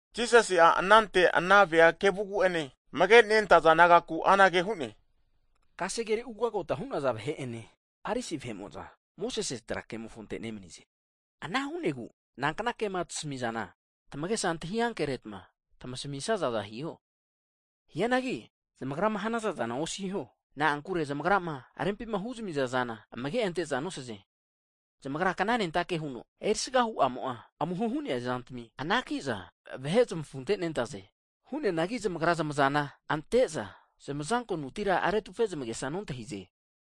Jisasi'a anante ana vea kevugu'ene, amage nentaza disaipol nagaku anage hu'ne. Kasegere ugagota hu'naza vahe'ene, Farisi vahe'mo'za, Mosesi kasege kemofonte nemnize. Ana hu'negu nankna ke'ma tmasmi'sazana, tamagesa antahi ankeretma, tmasmisazaza hiho. Hianagi zamagrama hanaza'zana osiho, na'ankure zamagrama rempima huzami'za zana amage' ante'za nosaze. Zamagra kna'nentake huno erisaga huama'a amuho hu'nea zantmi anakiza vahe zmafunte nentaze. Hu'neanagi zmagra zmazana ante'za zmazankonutira retufe zmage'sa nontahize.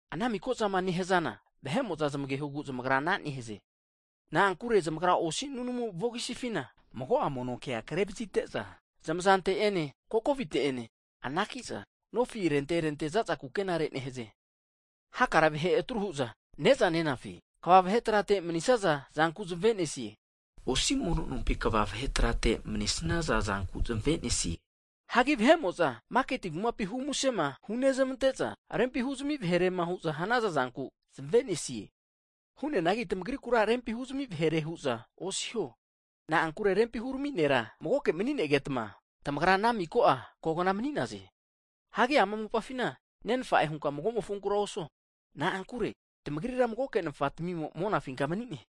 Ana mikazama nehzana vahe'mo'za zmagehogu zmagra ana nehaze. Na'ankure zamagra osi nunamu vogisifina mago'a mono kea kre vazite'za, zmazante'ene kokovite'ene anaki'za nofi arente arente zaza kukenare nehaze. Hakare vahe atru hu'za ne'za nenafi kva vahe trate mni'zanku zamavenesi'za, osi mono nompi kva vahe trate mnisnaza zanku zme nesie. Hagi vahe'mo'za maketi kumapima humusema hunezmante'za, rempi huzami vahere'ma hu'za hanaza'zanku zmenesie. Hu'neanagi tamagrikura rempi huzami vahere hu'za osiho. Na'ankure Rempi hurami'nera Magoke mni'negetma, tamagra ana miko'a kogna mni'naze. Hagi ama mopafina nenfa'e hunka mago'mofonkura osuo, na'ankure tamagrira Magoke Nfa'tmimo monafinka mani'ne.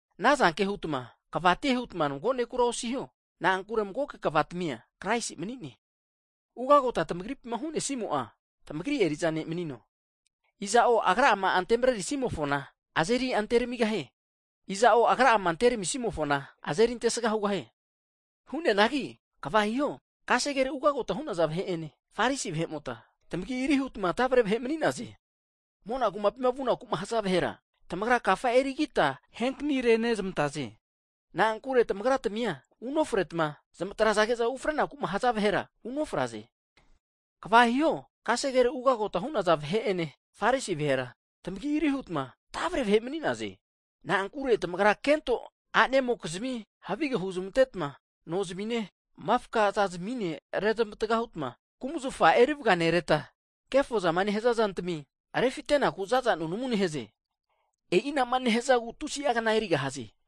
Anazanke hutma kvatie hutma mago nekura osiho. Na'ankure magoke Kva tmia Kraisi mni'ne. Ugagotama tmagri'pima hu'nesnimo'a, tmagri eri'za ne' manino. Iza'o agra'ama ante marerisimofona, azeri anteramigahie, iza'o agra'ama anterami'simofona, azeri antesga hugahie. Hu'neanagi kva hiho, kasegere ugagota hu'naza vahe'ene, Farisi vahe'mota, tamagi'ari hutma tavre vahe mni'naze. Mona kumapima vunaku haza vahera, tamagra kafa erigita ahenkani renezmantaze. Na'ankure tamagra tmia unofretma zmatrage'za ufrenaku'ma haza vahera unofraze. [Kva hiho, kasegere ugagota hu'naza vahe'ene, Farisi vahera tamagi'ari hutma tavre vahe mni'naze. Na'ankure tamarga kento a'nemokizmi havige hunezmanteta nozimine, mafka zazimine rezmatga hutma kumzafa erivganereta, kefo zama nehaza zantami refitenaku za'za nunamu nehaze. E'i ana'ma nehzagu tusi'a kna erigahaze.]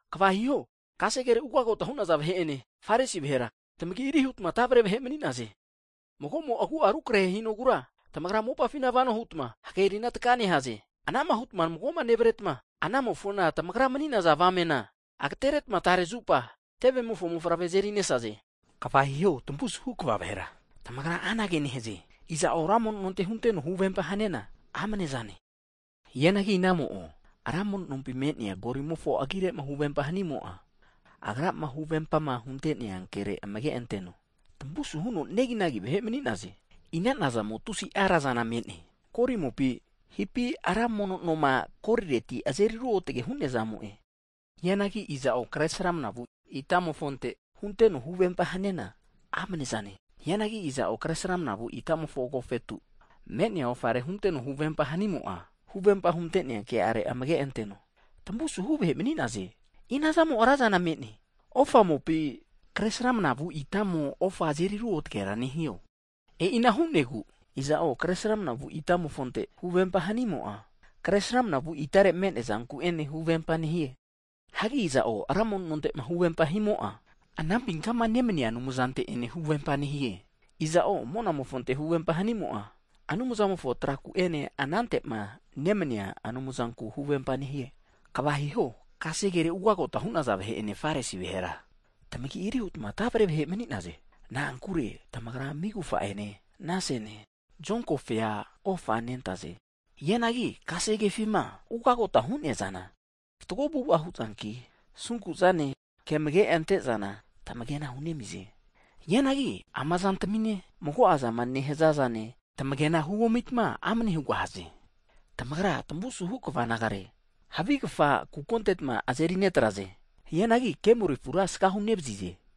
Kva hiho, kasere ugagota hu'naza vahe'ene, Farisi vahera, tamagiri hutma tavre vahe mni'naze. Mago'mo agu'a akarahe hinogura, tamagra mopafina vanohutma, hagerina taka nehaze. Anama hutma mago'ma nevretma, anamofona tamagra mni'naza avamena ageteretma tarezupa tevemofo mofavre azerinesaze. Kva hiho, tamavu'suhu kva vahera, tamagra anage nehaze, iza'o ra mono nonte hunteno huvempa haniana, amne zane! Hianagi inamo'o ra mono nompima me'nea kolimofo agire'ma huvempa hanimo'a, agrama huvempama hunte'nea kere amage anteno. Tamavu suhuno neginagi vahe mni'naze! Ina'nazamo tusi'a razana me'ne, koli mopi, hipi ra mono nomo'ma koliretima azeri ruotge hu'nea zamo'e? Hianagi iza'o, kre sramnavu itamofonte hunteno, huvempa haniana amne'zane. Hianagi iza'o kre sramnavu itamofo agofetu me'nea ofare hunteno huvempama hanimo'a, huvempama hunte'nea ke'are amage anteno. Tamusuhu vahe mni'naze! Ina'nazamo razana me'ne, ofamopi, kre sramnavu itamo ofa azeri ruotgera nehio? E'ina hu'negu, iza'o kre sramnavu itamofonte huvempa hanimo'a, kre sramnavu itare me'neazanku'ene huvempa nehie. Hagi iza'o ra mono nonte'ma huvempama himo'a, anampinkama nemnia Anumzante ene huvempa nehie. Iza'o monamofonte huvempa hanimo'a Anumzamofo traku'ene, anantema nemnia Anumzanku huvempa nehie. Kva hiho, kasegere ugagota hu'naza vahe'ene Farisi vahera, tamagi'ari hutma tavre vahe mni'naze. Na'ankure tamagra migufa'ene, nasene, zonkofea ofa nentaze. Hianagi kasegefima ugagota hu'neazana, fatgo avu'ava huzanki, asunkuzane, ke amage ante'zana tamagena hu'nemize. Hianagi ama zantmine, mago'azama nehzazane tamagena huomitma amne hugahaze. Tamagra tamuvusuhu kva nagare, havigfa kuko antetma azeri netraze, hianagi kemoli afura asagahu nevazize.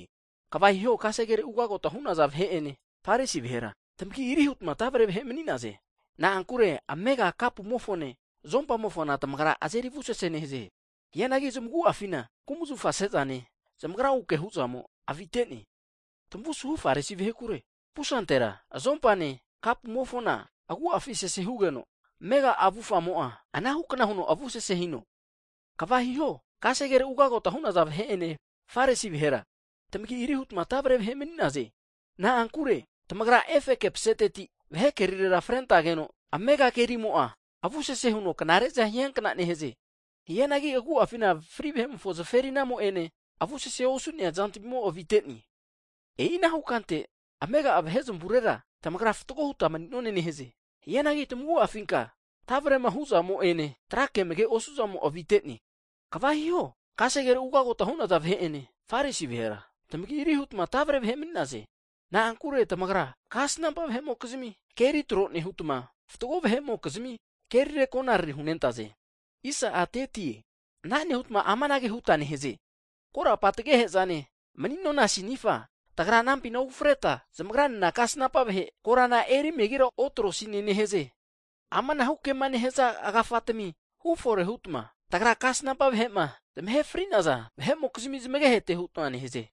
Kva hiho, kasegere ugagota hu'naza vahe'ene, Farisi vahera, tamagi'ari hutma tavre vahe mni'naze. Na'ankure amega kapumofone, zompamofona tamagra azeri avusese nehaze. Hianagi zmagu'afina kumzafa'sezane zamagraguke huzamo avitene. Tamavu asuhu Farisi vahekure, pusantera zompane kapumofona agu'afi sesehugeno, amega avufamo'a anahu kna huno avusese hino. Kva hiho, kasegere ugagota hu'naza vahe'ene, Farisi vahera, tamagi'ari hutma tavre vahe mni'naze. Na'ankure tamagra efeke paseteti vahe kerire frentageno amega kerimo'a avusese huno knare'za hiakna nehaze, hianagi agu'afinka fri vahe'mokizmi zferinamo ene avusese osu'nea zantamimo avite'ne. E'inahu kante amega'a vahe zamurera tamagra fatgo huta mni'none nehaze. Hianagi tmagu'afinka tavrema huzamo'ene tra ke amage osu'zamo avite'ne. Kva hiho, kasegere ugagota hu'naza vahe'ene, Farisi vahera, tamagi'ari hutma tavre vahe mni'naze, na'ankure tamagra kasnampa vahe'mokizimi keri tro nehutma, fatgo vahe'mokizmi keri konariri hunentaze. Ana nehutma amanage huta nehaze, Korapa tagehezane mni'nona sinifa, tagra anampina ufreta, zmagra'nena kasnampa vahe korana eri megira otro'sine nehaze. Amanahu kema nehazana agafatmi hufore hutma, tagra kasnampa vahema zmahe fri'naza vahe'mokizmi zmagehete hutma nehaze.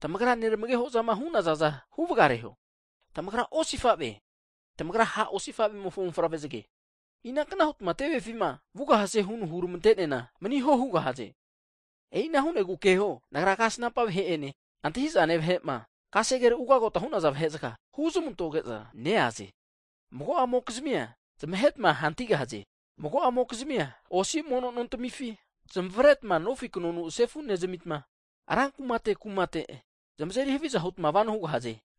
Tamagra nermageho'zama hunaza'zana huvgareho. Tamagra osifave, tamagra ha' osifavemofo mofavre zge. Inankna hutma tevefima vugahaze huno huramante'neana maniho hugahaze? E'ina hu'negu keho, Nagra kasnampa vahe'ene, antahi'zane vahe'ma, kasegere ugagota hu'naza vahezga, huzmantoge'za neaze, mago'amokizimia, zmahetma hantigahaze, mago'amokizmia osi mono'nontamifi zmazeritma nofi knonu sefu nezamitma, ra kumate kumate zmazeri haviza hutma vano hugahaze.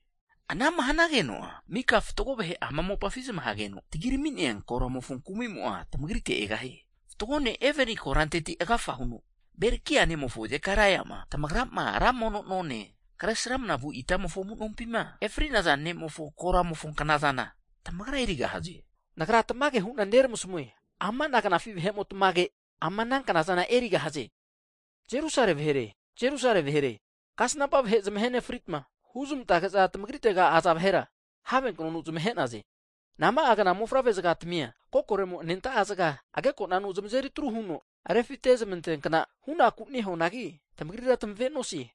Ana'ma hanageno'a mika fatgo vahe ama mopafi zmahageno tagirami'nea koramo'a, tmagrite egahie. Fatgo ne' Eboli koranteti agafa huno Berekaia nemofo Zekaraiama, tamagra ma ra mono none, kre sramanavu itamofo amu'nompima ahe fri'naza ne'mofo korante vugahie. Nagra tamage hu'na neramasmue. Amana knafi vahe'motmage', ama ana knazana erigahaze. Jerusale vahere, Jerusale vahere. Kasnampa vahe zamahenefritma, huzmantege'za tmagritega aza vahera have knonu zmahe'naze. Nama'a kna mofavre'zgatmia kokoremo anenta'a zga agekonanu zmazeri atru huno refite zmanteankna hunaku nehuanagi tamagria tamavenosie.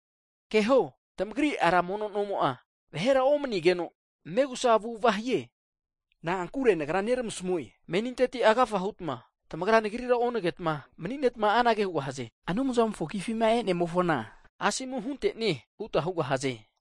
Keho, tamagri ra mono nomo'a, vahera omnigeno megusa avu'ava hie. Na'ankure Nagra neramasmue, meninteti agafa hutma tamagra Nagrira onagetma maninetma anage hugahaze. Anumzamofo agifima e'nemofona asomu hunteno huta hugahaze.